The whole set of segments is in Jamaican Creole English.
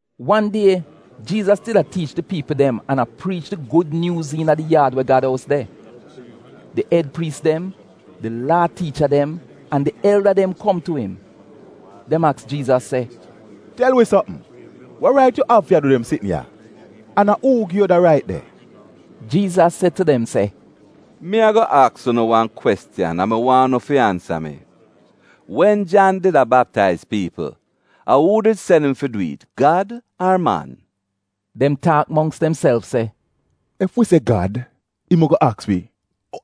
Wan die, Jiizas did a tiich di piipl dem an a priich di Gud Nyuuz iina di yaad we Gad ous de. Di ed priis dem, di Laa tiicha dem an di elda dem kom tu im. Dem aks Jiizas se, “Tel wi sopm, wa rait yu av fi a du dem sitn ya? An a uu gi yu da rait de?” Jiizas se tu dem se, “Mi ago aks unu wan kwestiyan an mi waahn unu fi ansa mi. Wen Jan did a baptaiz piipl, a uu did sen im fi dwi'it, Gad ar man?” Dem taak mongks demself se, “Ef wi se, ‘Gad,’ im ago aks wi,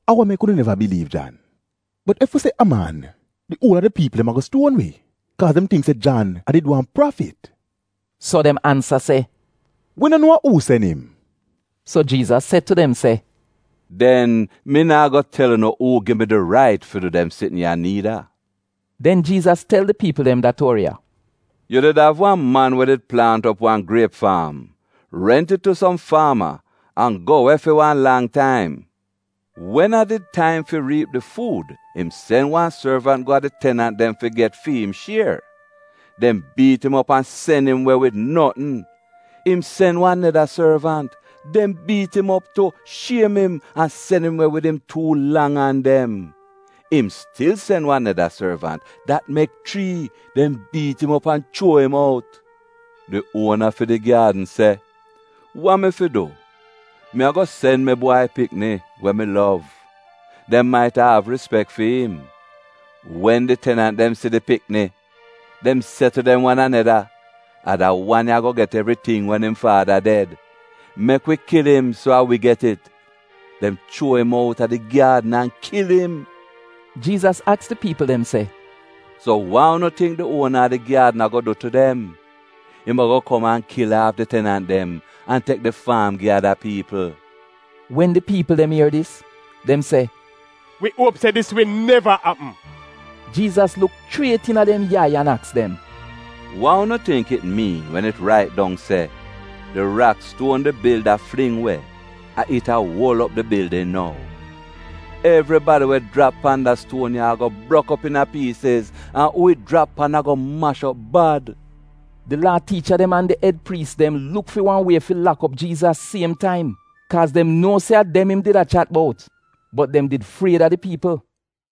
‘a wa mek unu neva biliiv Jan?’ Bot ef wi se, ‘a man,’ di uol a di piipl dem ago stuon wi, kaaz dem tingk se Jan a did wan prafit.” So dem ansa se, “Wi no nuo a uu sen im.” So Jiizas se tu dem se, “Den mi naa go tel unu uu gi mi di rait fi du dem sitn ya niida.” Den Jiizas tel di piipl dem da tuori ya: “Yu did av wan man we did plaant op wan griep faam, rent it tu som faama an go we fi wan lang taim. Wen a did taim fi riip di fuud, im sen wan sorvant go a di tenant dem fi get get fi'im shier. Dem biit im op an sen im we wid notn. Im sen wan neda sorvant, dem biit im op tu, shiem im, an sen im we wid im tuu lang an dem. Im stil sen wan neda sorvant — dat mek chrii. Dem biit im op an chuo im out. “Di uona fi di gyaadn se, ‘Wa mi fi du? Mi ago sen mi bwai pikni, we mi lov. Dem maita av rispek fi'im.’ “Wen di tenant dem si di pikni, dem se tu dem wan aneda, ‘A da wan ya ago get evriting wen im faada ded. Mek wi kil im, so a wi get it.’ Dem chuo im outa di gyaadn an kil im.” Jiizas aks di piipl dem se “So wa unu tingk di uona a di gyaadn ago du tu dem? Im ago kom an kil aaf di tenant dem an tek di faam gi ada piipl.” Wen di piipl dem ier dis, dem se, “Wi uop se dis wi neva apm!” Jiizas luk chriet iina dem yai an aks dem, “Wa unu tingk it miin wen it rait dong se: “ ‘Di rakstuon di bilda fling we, a it a uol op di bildin nou’? Evribadi we jrap pan da stuon ya ago brok op iina piisiz, an uu it jrap pan ago mash op bad.” Di Laa tiicha dem an di ed priis dem luk fi wan wie fi lak op Jiizas siem taim, kaaz dem nuo se a dem im did a chat bout. Bot dem did fried a di piipl.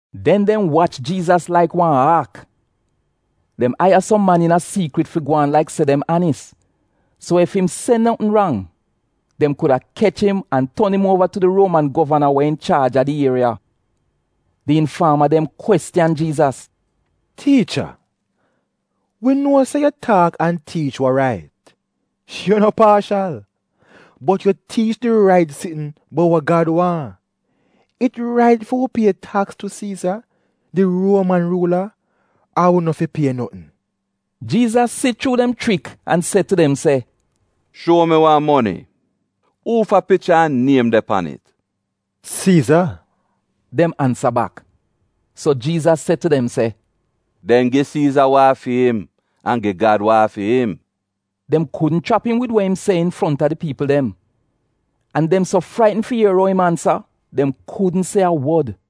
Den dem wach Jiizas laik wan aak. Dem aiya som man iina siikrit fi gwaan laik se dem anis, so ef im se notn rang dem kuda kech im an ton im uova tu di Ruoman govana we inchaaj a di ieriya. Di infaama dem kwestiyan Jiizas, “Tiicha, wi nuo se yu taak an tiich wa rait. Yu no paashal, bot yu tiich di rait sitn bout wa Gad waahn. It rait fi wi pie taks tu Siiza, di Ruoman ruula ar wi no fi pie notn?” Jiizas si chuu dem chrik an se tu dem se, “Shuo mi wan moni. Uufa picha an niem de pan it?” “Siiza,” dem ansa bak. So Jiizas se tu dem se, “Den gi Siiza wa a fi'im, an gi Gad wa a fi'im.” Dem kudn chrap im wid wa im se infronta di piipl dem. An dem so fraitn fi ier ou im ansa, dem kudn se a wod.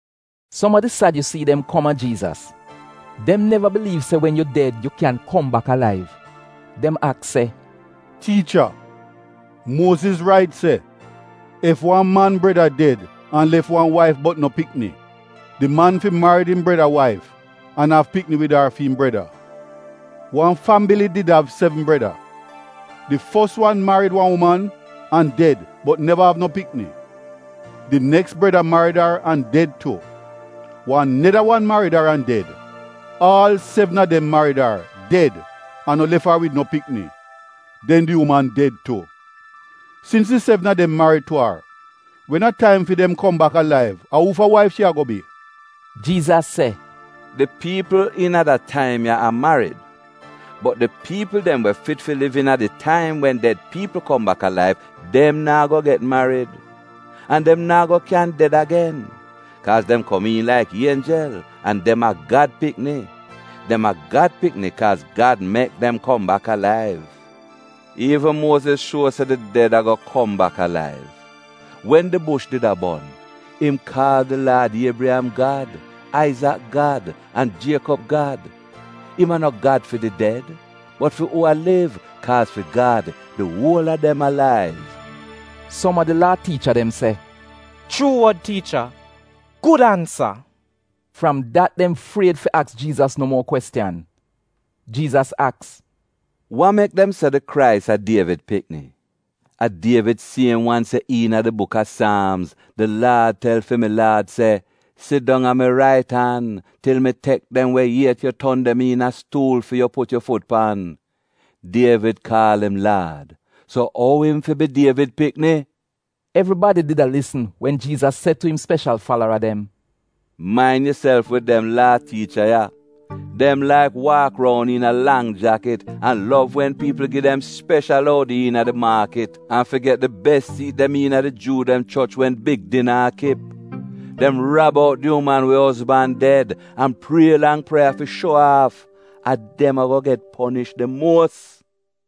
Som a di Sadyusii dem kom a Jiizas (dem neva biliiv se wen yu ded yu kyaahn kom bak alaiv). Dem aks se, “Tiicha, Muoziz rait se ef wan man breda ded an lef wan waif bot no pikni, di man fi marid im breda waif an av pikni wid ar fi'im breda. Wan fambili did av sevn breda. Di fos wan marid wan uman an ded bot neva av no pikni. Di neks breda marid ar an ded tu. Wan neda wan marid ar an ded, aal sevn a dem marid ar, ded, an no lef ar wid no pikni. Den di uman ded tu. Sins di sevn a dem marid tu ar, wen a taim fi dem kom bak alaiv a uufa waif shi ago bi?” Jiizas se, “Di piipl iina da taim ya a marid, bot di piipl dem we fit fi liv iina di taim wen ded piipl kom bak alaiv, dem naa go get marid. An dem naa go kyan ded agen, kaaz dem kom iin laik ienjel an dem a Gad pikni. Dem a Gad pikni kaaz Gad mek dem kom bak alaiv. Iivn Muoziz shuo se di ded ago kom bak alaiv. Wen di bush did a bon, im kaal di Laad ‘Iebriyam Gad, Aizak Gad an Jiekob Gad.’ Im a no Gad fi di ded, bot fi uu a liv; kaaz fi Gad, di uol a dem alaiv.” Som a di Laa tiicha dem se, “Chuu wod tiicha, gud ansa!” Fram dat dem fried fi aks Jiizas no muo kwestiyan. Jiizas aks, “Wa mek dem se di Krais a Dievid pikni? A Dievid siem wan se iina di Buk a Saamz: “ ‘Di Laad tel fi mi Laad se: “Sidong a mi rait an til mi tek dem we iet yu ton dem iina stuul fi yu put yu fut pan.” ’ Dievid kaal im ‘Laad.’ So ou im fi bi Dievid pikni?” Evribadi did a lisn wen Jiizas se tu im speshal falara dem “Main yuself wid dem Laa tiicha ya. Dem laik waak roun iina lang jakit, an lov wen piipl gi dem speshal oudi iina di maakit an fi get di bes siit dem iina di Juu dem choch wen big dina a kip. Dem rab out di uman we ozban ded an prie lang prieya fi shuo aaf. A dem ago get ponish di muos.”